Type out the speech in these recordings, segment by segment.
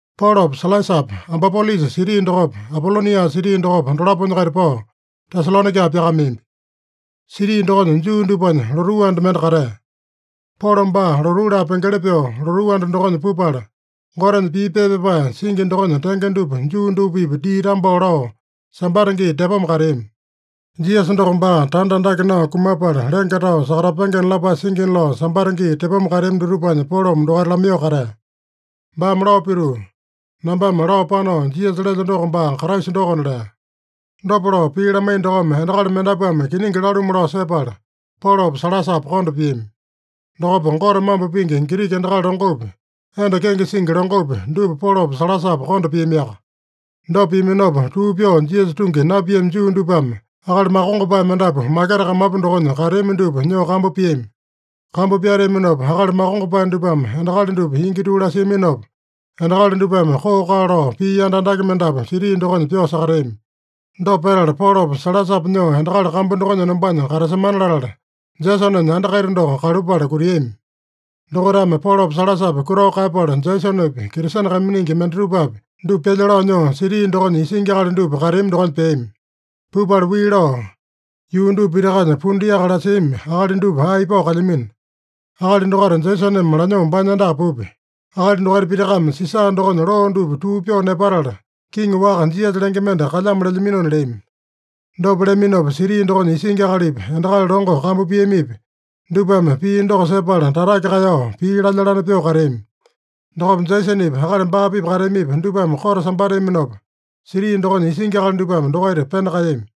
Polopa Sailasapa Ampipolisa siti dokopa, Apolonia siti dokopa, dolaponya-kaita pao, Tesalonaika pyakameambi. Siti dokonya Juu dupanya lotuu anda mende katea. Polo baa lotuu laa pengeli pyoo lotuu anda dokonya pupala, Gotenya pii pepa pyapae singi dokonya tenge dupa Juu dupa-pipa dii tambao lao, Sambata gii tepoma kateami. Jisasa doko baa tanda andake nao kumapala, lenge tao sakatapengena lapae singina lao Sambata gii tepoma kateami dutupanya Polome dokaita lamaiyoo katea. Baame lao pituu, “Nambame lao panao Jisasa lelyo doko baa Kraisa dokona” lea. Dopa lao pii lamaiya dokome, endakali mendapuame kiningi lalumu lao sepala, Polopa Sailasapa konda piami. Dokopa Gote mambo pingi Giriki endakali longopi, enda kenge singi longopi, dupa Polopa Sailasapa konda piamiaka. Dopa piaminopa, tuu pyoo Jisasa tungi napiami Juu dupame akali makongopae mendapu maketa kamapu dokonya kateami dupa nyoo kambu piami. Kambu pyateaminopa, akali makongopae dupame endakali dupa ingi tuu lasiaminopa, endakali dupame koo-kaa lao pii yanda andake mendapu siti dokonya pyoo sakateami. Dopa petala, Polopa Sailasapa nyoo endakali kambu dokonya enombanya katasemana latala, Jesonenya anda kaita doko kalupala kutiami. Dokaitame Polopa Sailasapa kutao kaeyapala, Jesonepi, Kristene kaiminingi mendatupapi, dupa pyalya lao nyoo siti dokonya isingi akali dupa kateami dokonya peami. Pupala wii lao, “Yuu dupa pitakanya pundu yaka lasiami akali dupa ae ipao kalyamino. Akali dokaita Jesoneme lanyoo baanya andaka pupya. Akali dokaita pitakame Sisa dokonya loo dupa tuu pyoo nepatala, kiŋi waka Jisasa lenge mende kalyamo lelyaminona” leami. Dopa leaminopa siti dokonya isingi akalipi, endakali longo kambu piamipi, dupame pii doko sepala tatake kaeyao, pii lalya-lane pyoo kateami. Dokopa Jesonepi, akali baa-pipa kateamipi, dupame kote sambateaminopa, siti dokonya isingi akali dupame dokaita pena kaeyami.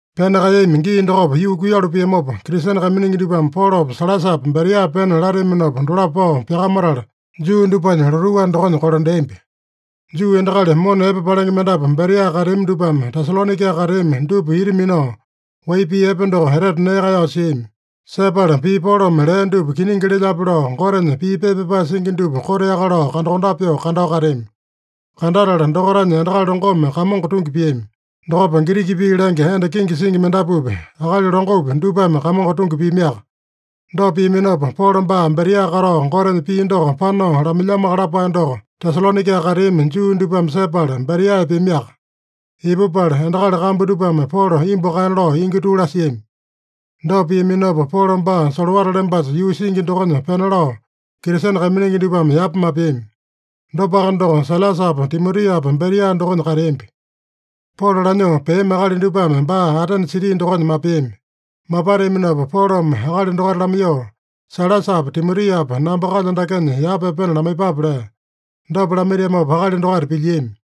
Pena kaeyami gii dokopa yuu kuiyalu piamopa, Kristene kaiminingi dupame Polopa Sailasapa Beria pena lateaminopa dolapo pao pyakamatala, Juu dupanya lotuu anda dokonya kolandeambi. Juu endakali mona epe palenge mendapu Beria kateami dupame Tesalonaika kateami dupa ita minao, wai pii epe doko etete nee kaeyao siami. Sepala pii Polome lea dupa kiningi lelyape lao, Gotenya pii pepa pyapae singi dupa koteaka lao kandakondape pyoo kandao kateami. Kandatala dokaitanya endakali longome Kamongo tungi piami. Dokopa Giriki pii lenge enda kenge singi mendapupi, akali longopi, dupame Kamongo tungi piamiaka. Dopa piaminopa, Polo baa Beria katao Gotenya pii doko panao lamailyamoaka lapae doko Tesalonaika kateami Juu dupame sepala, Beria epeamiaka. Ipupala, endakali kambu dupame Polo imbu kaena lao ingi tuu lasiami. Dopa piaminopa, Polo baa solowata lembasa yuu singi dokonya pena lao, Kristene kaiminingi dupame yapa mapeami. Dopaka doko, Sailasapa Timotiapa Beria dokonya kateambi. Polo lanyoo peami akali dupame baa Atene siti dokonya mapeami. Mapateaminopa Polome akali dokaita lamaiyoo, “Sailasapa Timotiapa namba kalyo dakenya yapa epena lamaiyepape” lea. Dopa lamaitiamopa akali dokaita pilyiami.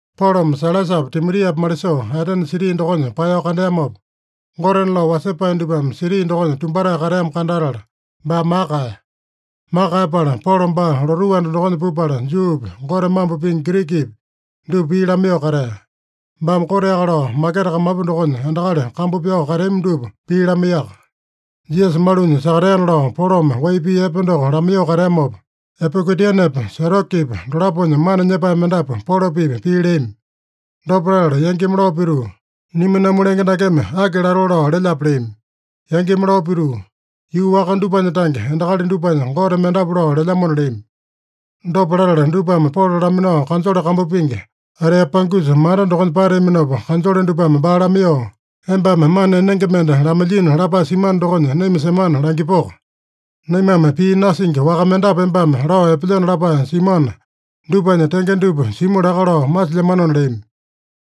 Polome Sailasapa Timotiapa malisoo, Atene siti dokonya paeyao kandeamopa, gotena lao wasepae dupame siti dokonya tumbatae kateamo kandatala, baa maka kaeya. Maka kaeyapala, Polo baa lotuu anda dokonya pupala, Juupi, Gote mambo pingi Girikipi, dupa pii lamaiyoo katea. Baame koteaka lao maketa kamapu dokonya endakali kambu pyao kateami dupa pii lamaiyaka. Jisasa malunya sakateana lao Polome wai pii epe doko lamaiyoo kateamopa, Epikurianepa Setokipa dolaponya mana nyepae mendapu Polo-pipa pii leami. Dopa latala yangimi lao pituu, “Niminamu lenge dakeme aki latoo lao lelyape?” leami. Yangimi lao pituu, “Yuu waka dupanya tange endakali dupanya gote mendapu lao lelyamona” leami. Dopa latala dupame Polo laminao kanjole kambu pingi, Areopagusa manda dokonya pateaminopa, kanjole dupame baa lamaiyoo, “Embame mana enenge mende lamailyino lapae simano dokonya naima semana langipoko? Naimame pii nasingi waka mendapu embame lao epelyeno lapae simuana, dupanya tenge dupa simu laka lao masilyamanona” leami.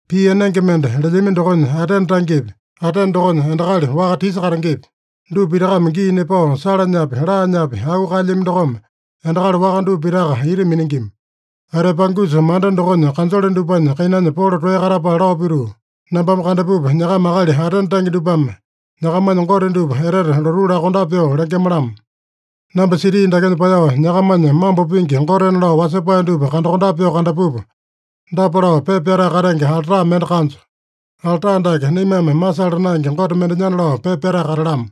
(Pii enenge mende lelyami dokonya Atene tangepi, Atene dokonya endakali waka tisa katengepi, dupa pitakame gii nepao salanyapi, laanyapi auu kaelyami dokome endakali waka dupa pitaka ita miningima.) Areopagusa manda dokonya kanjole dupanya kainanya Polo toeya katapala lao pituu, “Nambame kandapupa, nyakama akali Atene tange dupame nyakamanya gote dupa etete lotuu lakondape pyoo lengema-lamo. Namba siti dakenya paeyao, nyakamanya mambo pingi gotena lao wasepae dupa kandakondape pyoo kandapupa, dapa lao pepa pyatae katenge alta mende kanjo: ‘Alta dake naimame masala naenge gote mendenyana’ lao pepa pyatae katalamo.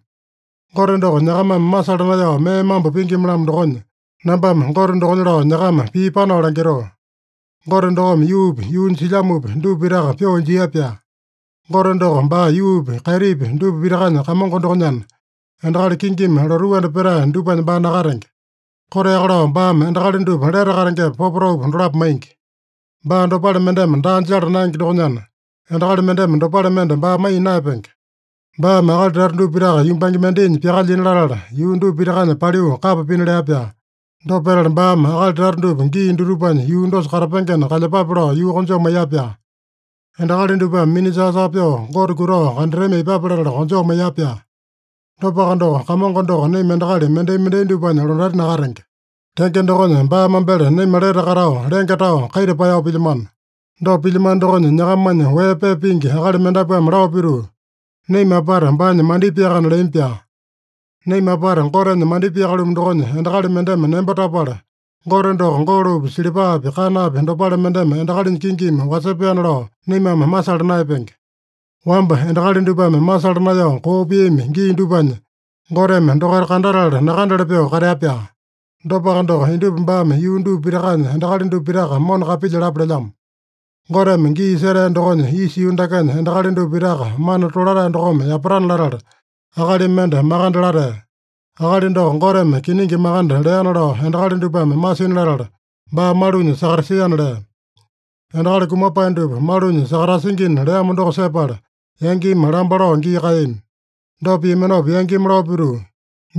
Gote doko nyakamame masala naeyao mee mambo pingima-lamo dokonya, nambame Gote dokonya lao nyakama pii panao langitoo. Gote dokome yuupi, yuunya silyamopi, dupa pitaka pyoo injia-pyaa. Gote doko baa yuupi, kaitipi dupa pitakanya Kamongo dokonyana, endakali kingimi lotuu anda petae dupanya baa nakatenge. Koteaka lao baame endakali dupa lete katengepa, popotaupa dolapo maingi. Baa dopale mendeme daa jala naenge dokonyana, endakali mendeme dopale mende baa maiya naeyapenge. Baame akali tata dupa pitaka yumbange mendainya pyakalyina latala, yuu dupa pitakanya paliu kapa pina lea-pyaa. Dopa petala baame akali tata dupa gii dutupanya yuu dosa katapengena kalyepape lao yuu konjoo maiya-pyaa. Endakali dupame mina-saa-saa pyoo Gote kutao kandatami aipape latala konjoo maiya-pyaa. Dopaka doko, Kamongo doko naima endakali mendai-mendai dupanya londati nakatenge. Tenge dokonya, baa mambele naima lete katao, lenge tao, kaita paeyao pilyamano. Dopa pilyamano dokonya, nyakamanya wee pepa pingi akali mendapuame lao pituu, ‘Naima apata baanya mandipaeyakana’ leami-pyaa. Naima apata Gotenya mandipaeyaka-lumu dokonya, endakali mendeme nembo tapala, Gote doko golopi, silipapi, kanapi dopale mendeme endakalinya kingimi wasepaena lao naimame masala naeyapenge. Wamba endakali dupame masala naeyao koo piami gii dupanya Goteme dokaita kandatala nakandele pyoo katea-pyaa. Dopaka doko, indupa baame yuu dupa pitakanya endakali dupa pitaka mona kapilyalapa lelyamo. Goteme gii setea dokonya, isa yuu dakenya endakali dupa pitaka mana tolatae dokome yapatana latala, akali mende makande latea. Akali doko Goteme kiningi makande leana lao endakali dupame masina latala baa malunya sakatasiana” lea. Endakali kumapae dupa malunya sakatasingina leamo doko sepala, yangimi lamba lao gii kaeyami. Dopa piaminopa yangimi lao pituu,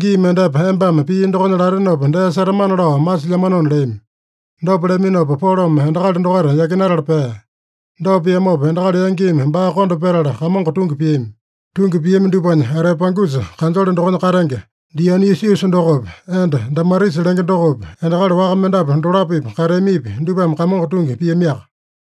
“Gii mendepa embame pii dokonya latenopa dee setamana lao masilyamanona” leami. Dopa leaminopa, Polome endakali dokaita yakinatala pea. Dopa piamopa, endakali yangimi baa konda petala, Kamongo tungi piami. Tungi piami dupanya, Areopagusa kanjole dokonya katenge Dionisiusa dokopi, enda Damarisa lenge dokopi, endakali waka mendapu dolapo-pipa kateamipi, dupame Kamongo tungi piamiaka.